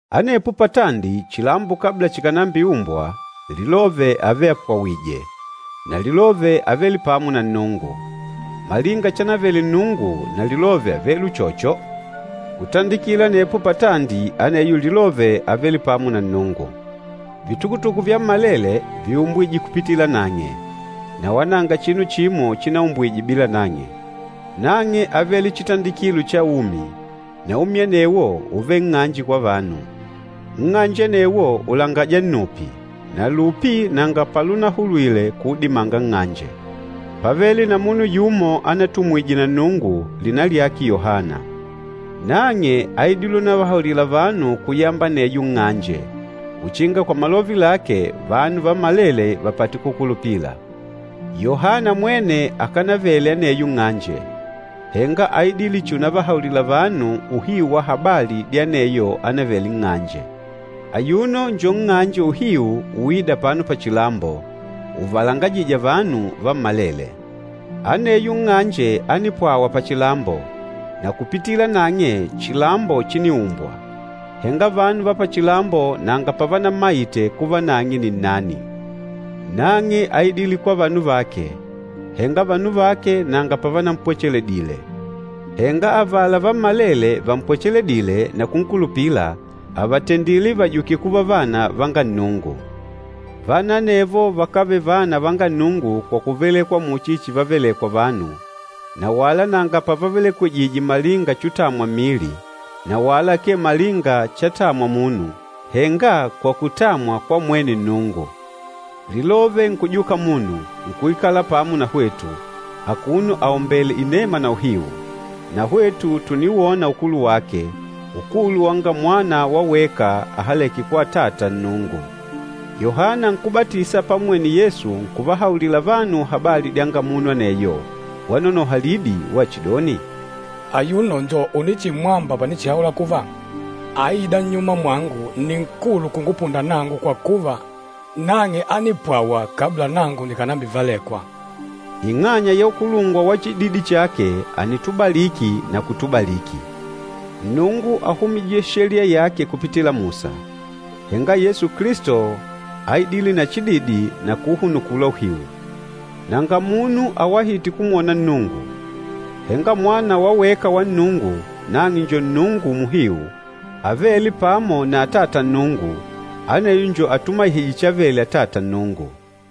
Anepo patandi, chilambo kabla chikànambiumbwa, Lilove ávele apwawììje, na Lilove ávele pamo na Nnungu. Malinga chanavele Nnungu na Lilove ávele uchocho. Kutandikila anepo patandi aneyo Lilove ávele pamo na Nnungu. Vitukutuku vyammalele víumbwije kupitila nang'e, na wala nanga chinu chimo chinaumbwije bila nang'e. Nang'e ávele chitandikilo cha umi na umi anewo úvele nng'anje kwa vanu. Nng'anje anewo ùlangaja nnupi, na lupi nanga palunahulwile kuudimanga nng'anje. Pávele na munu yumo anatumwije na Nnungu, lina lyake Yohana. Nang'e áidile unavahaulila vanu kuyamba aneyo nng'anje, uchinga kwa malove lake, vanu vammalele vapate kukulupila. Yohana mwene akánavele aneyo nng'anje, henga áidile chihi unavahaulila vanu uhiu wa habali dya aneyo ánavele nng'anje. Ayuno njo nng'anje uhiu uîda apano pachilambo, uvalangajîja vanu vammalele. Aneyo nng'anje ánipwawa pachilambo, na kupitila nang'e chilambo chíniumbwa, henga vanu va pachilambo nanga pavanammaite kuva nang'e ni nnani. Nang'e áidile kwa vanu vake, henga vanu vake nanga pavanampwecheledile. Henga avala vammalele vampwecheledîle na kunkulupila, àvatendile vajuke kuva vana vanga Nnungu. Vana anevo vakávele vana vanga Nnungu kwa kuvelekwa muchi chivavelekwa vanu, na wala nanga pavavelekwejije malinga chutamwa mmili, na wala akee malinga chatamwa munu, henga kwa kutamwa kwa mwene Nnungu. Lilove nkujuka munu, nkuikala pamo na hwetu, akuno aombèèle inema na uhiu. Na hwetu tùniwona ukulu wake, ukulu wanga Mwana wa weka ahalêke kwa Atata Nnungu. Yohana Nkúbatisa pammwene Yesu, nkuvahaulila vanu habali dyanga munu aneyo, wanonoha lidi wachidoni, “Ayuno njo unichimwamba panichihaula kuva, ‘Aîda nnyuma mwangu nni nkulu kungupunda nangu kwa kuva, nang'e ánipwawa kabla nangu nikànambivelekwa.’” Ing'anya ya ukulungwa wa chididi chake ànitubaliki na kutubaliki. Nnungu áhumije Sheliya yake kupitila Musa, henga Yesu Kilisto áidile na chididi na kuuhunukula uhiu. Nanga munu awahîte kumwona Nnungu. Henga Mwana wa weka wa Nnungu, nang'e njo Nnungu muhiu, avêle pamo na Atata Nnungu, aneyo njo atumaihîje chavele Atata Nnungu.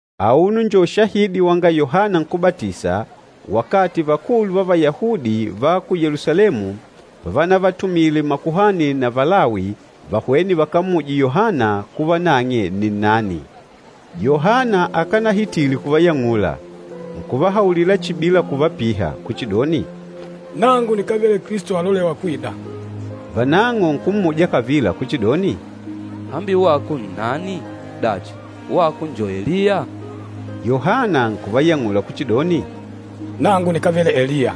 Auno njo ushahidi wanga Yohana Nkúbatisa wakati Vakulu va Vayahudi va ku Yelusalemu pavanavatumile makuhani na Valawi vahwene vakammuje Yohana kuva nang'e nni nnani. Yohana akanahitile kuvayang'ula, nkuvahaulila chihi bila kuvapiha kuchidoni, “Nangu nikávele Kilisto alolêwa kwida.” Vanang'o nkummuja kavila kuchidoni, “Hambi wako nnani? Dachi, wako njo Eliya?” Yohana nkuvayang'ula kuchidoni, “Nangu nikávele Eliya.”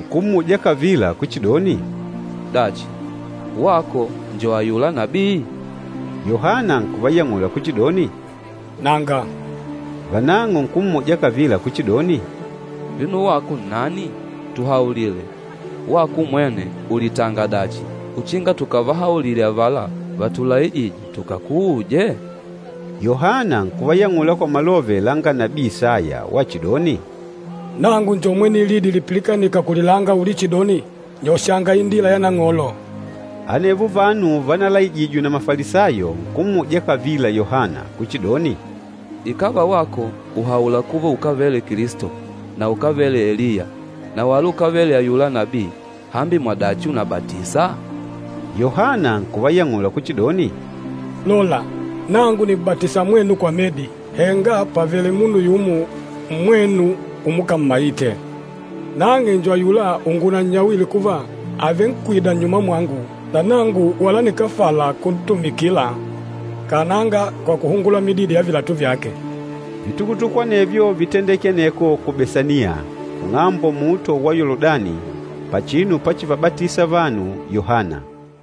Nkummuja kavila kuchidoni, “Dachi, wako njo ayula nabii?” Yohana nkuvayang'ula kuchidoni, “Nanga.” Vanang'o nkummuja kavila kuchidoni, “Vino wako nnani? Tuhaulile, wako umwene ùlitanga dachi uchinga tukavahaulile avala vatulaijîje tukakuuje?” Yohana nkuvayang'ula kwa malove langa nabii Isaya wachidoni, “Nangu njo mwene lidi lipilikanîka kulilanga ulichidoni, ‘Nyoshanga indila ya Nang'olo.’” Anevo vanu vanalaijijwe na Mafalisayo, nkummuja kavila Yohana kuchidoni, “Ikàva wako ùhaula kuva ukávele Kilisto, na ukávele Eliya, na wala ukávele ayula nabii, hambi mwadachi ùnabatisa?” Yohana nkuvayang'ula kuchidoni, “Lola, nangu nìm'batisa mwenu kwa medi, henga pàvele munu yumo mmwenu umukammaite. Nang'e njo ayula ungunannyawile kuva, àvenkwida nnyuma mwangu, na nangu wala nikáfala kuntumikila kananga kwa kuhungula mididi ya vilatu vyake.” Vitukutuku anevyo vítendeke aneko ku Besaniya, kung'ambo luhunde lwa Yoludani, pachinu pachivabatisa vanu Yohana.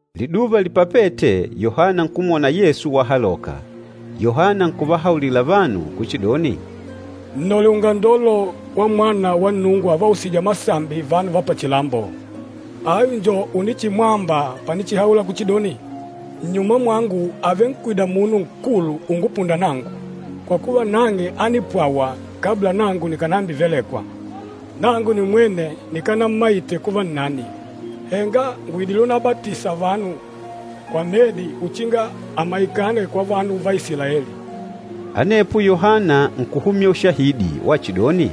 Liduva lipapête Yohana nkumwona Yesu wahaloka, Yohana nkuvahaulila vanu kuchidoni, “Nnole ungandolo wamwana wa Nnungu avausîja masambi vanu va pachilambo! Ayu njo unichimwamba panichihaula kuchidoni, ‘Nnyuma mwangu àvenkwida munu nkulu ungupunda nangu, kwa kuva nang'e ánipwawa kabla nangu nikànambivelekwa!’ Nangu nimwene nikanammaite kuva nnani, henga ngùidile unabatisa vanu kwa medi uchinga amaikane kwa vanu va Isilaeli.” Anepo Yohana nkuhumya ushahidi wachidoni,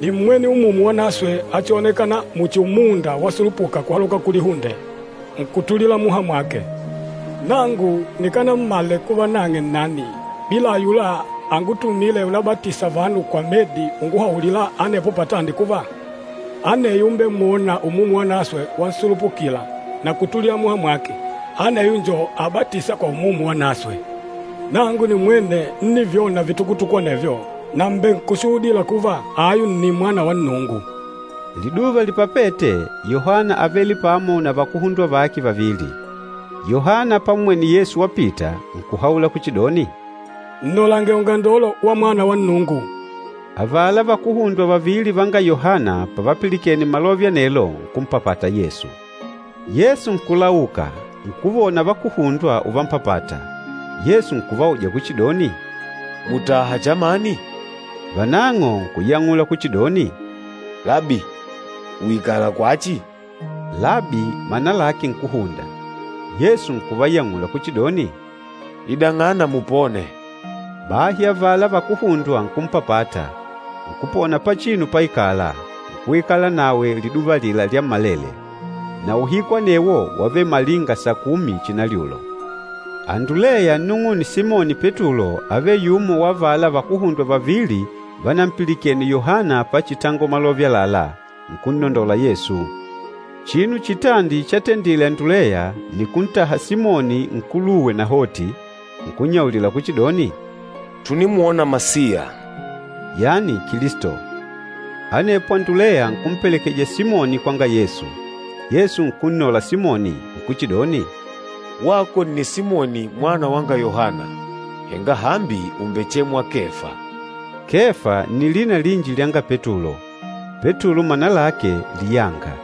“Nímmwene Umumu Wanaswe achionekâna muchi umunda wasulupuka kuhaloka kulihunde, nkutulila muha mwake. Nangu nikánammale kuva nang'e nnani, bila ayula angutumîle unabatisa vanu kwa medi unguhaulila anepo patandi kuva, ‘Aneyo umbemwôna Umumu Wanaswe wansulupukila, na kutulila muha mwake, aneyo njo abatîsa kwa Umumu Wanaswe.’ Nangu nimwene ńnivyona vitukutuku anevyo, na mbènkushuhudila kuva, ayu nni Mwana wa Nnungu.” Liduva lipapête, Yohana ávele pamo na vakuhundwa vake vavili. Yohana pammwene Yesu wapita, nkuhaula kuchidoni, “Nnolange ungandolo wa mwana wa Nnungu.” Avala vakuhundwa vavili vanga Yohana pavapilikene malove anelo, nkumpapata Yesu. Yesu nkulauka, nkuvona vakuhundwa uvammpapata, Yesu nkuvauja kuchidoni, “Mùtaha chamani?” Vanang'o nkuyang'ula kuchidoni, “Labi ùikala kwachi?” Labi mana lake Nkúhunda. Yesu nkuvayang'ula kuchidoni, “Idang'ana mupone.” Bahi avala vakuhundwa nkumpapata, nkupona pachinu páikàlà, nkuikala nawe liduva alila lyammalele. Na uhiku anewo wávele malinga sakumi chinalyulo. Anduleya nnung'une Simoni Petulo ávele yumo wa avala vakuhundwa vavili vanampilikene Yohana pachitangola malove àlalá, nkunnondola Yesu. Chinu chitandi chatendile Anduleya, ni kuntaha Simoni nkuluwe nahoti, nkunnyaulila kuchidoni, “Tùnimwona Masiya,” yani Kilisto. Anepo Anduleya nkumpelekeja Simoni kwanga Yesu. Yesu nkunnola Simoni, nkuchidoni, “Wako nni Simoni mwana wanga Yohana, henga hambi ùmbechemwa Kefa.” Kefa nni lina linji lyanga Petulo, Petulo mana lake, “liyanga.”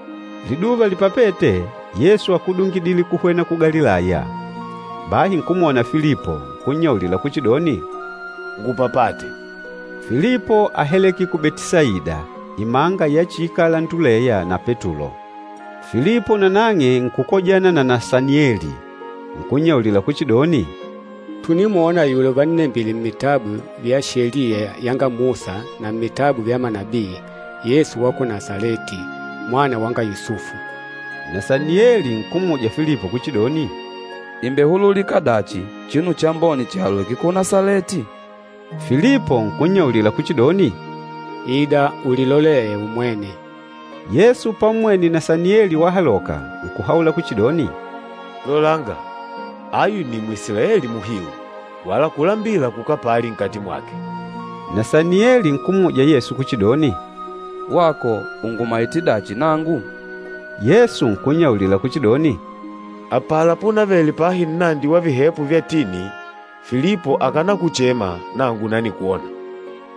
Liduva lipapête, Yesu ákudungidile kuhwena ku Galilaya. Bahi nkumwona Filipo, nkunnyaulila kuchidoni, “Ngupapate.” Filipo áhaleke ku Betisaida, imanga yachiikala Anduleya na Petulo. Filipo nanang'e nkukojana na Nasanieli, nkunnyaulila kuchidoni, “Tùnimwona ayula uvannembile mmitabu vya Sheliya yanga Musa na mmitabu vya manabii, Yesu wa ku Nasaleti, mwana wanga Yusufu.” Nasanieli nkummuja Filipo kuchidoni, “Ìmbehululika dachi chinu chambone chihaloke ku Nasaleti?” Filipo nkunnyaulila kuchidoni, “Ida ulilolee umwene.” Yesu pammwene Nasanieli wahaloka, nkuhaula kuchidoni, “Lolanga! Ayu nni Mwisilaeli muhiu, wala kulambila kukapali nkati mwake.” Nasanieli nkummuja Yesu kuchidoni, “Wako ùngumaite dachi nangu?” Yesu nkunnyaulila kuchidoni, “Apala punavele pahi nnandi wa vihepo vya tini, Filipo akànakuchema, nangu nanikwona.”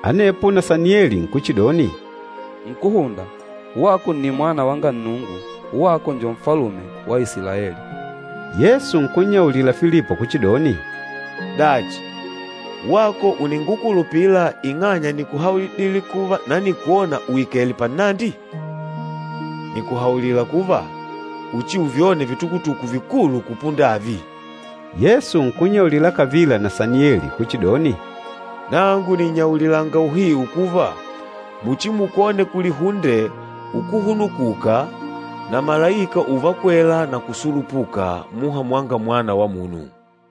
Anepo Nasanieli nkuchidoni, “Nkúhunda, wako nni Mwana wanga Nnungu, wako njo Nfalume wa Isilaeli.” Yesu nkunnyaulila Filipo kuchidoni, “Dachi, wako ùningukulupila ing'anya nìkuhaulidile kuva nanikwona uikèlè pannandi? Nìkuhaulila kuva, uchiuvyone vitukutuku vikulu kupunda avi.” Yesu nkunnyaulila kavila Nasanieli kuchidoni, “Nangu nìnnyaulilanga uhiu kuva, muchimukwone kulihunde ukuhunukuka na malaika uvakwela na kusulupuka muha mwanga Mwana wa Munu.”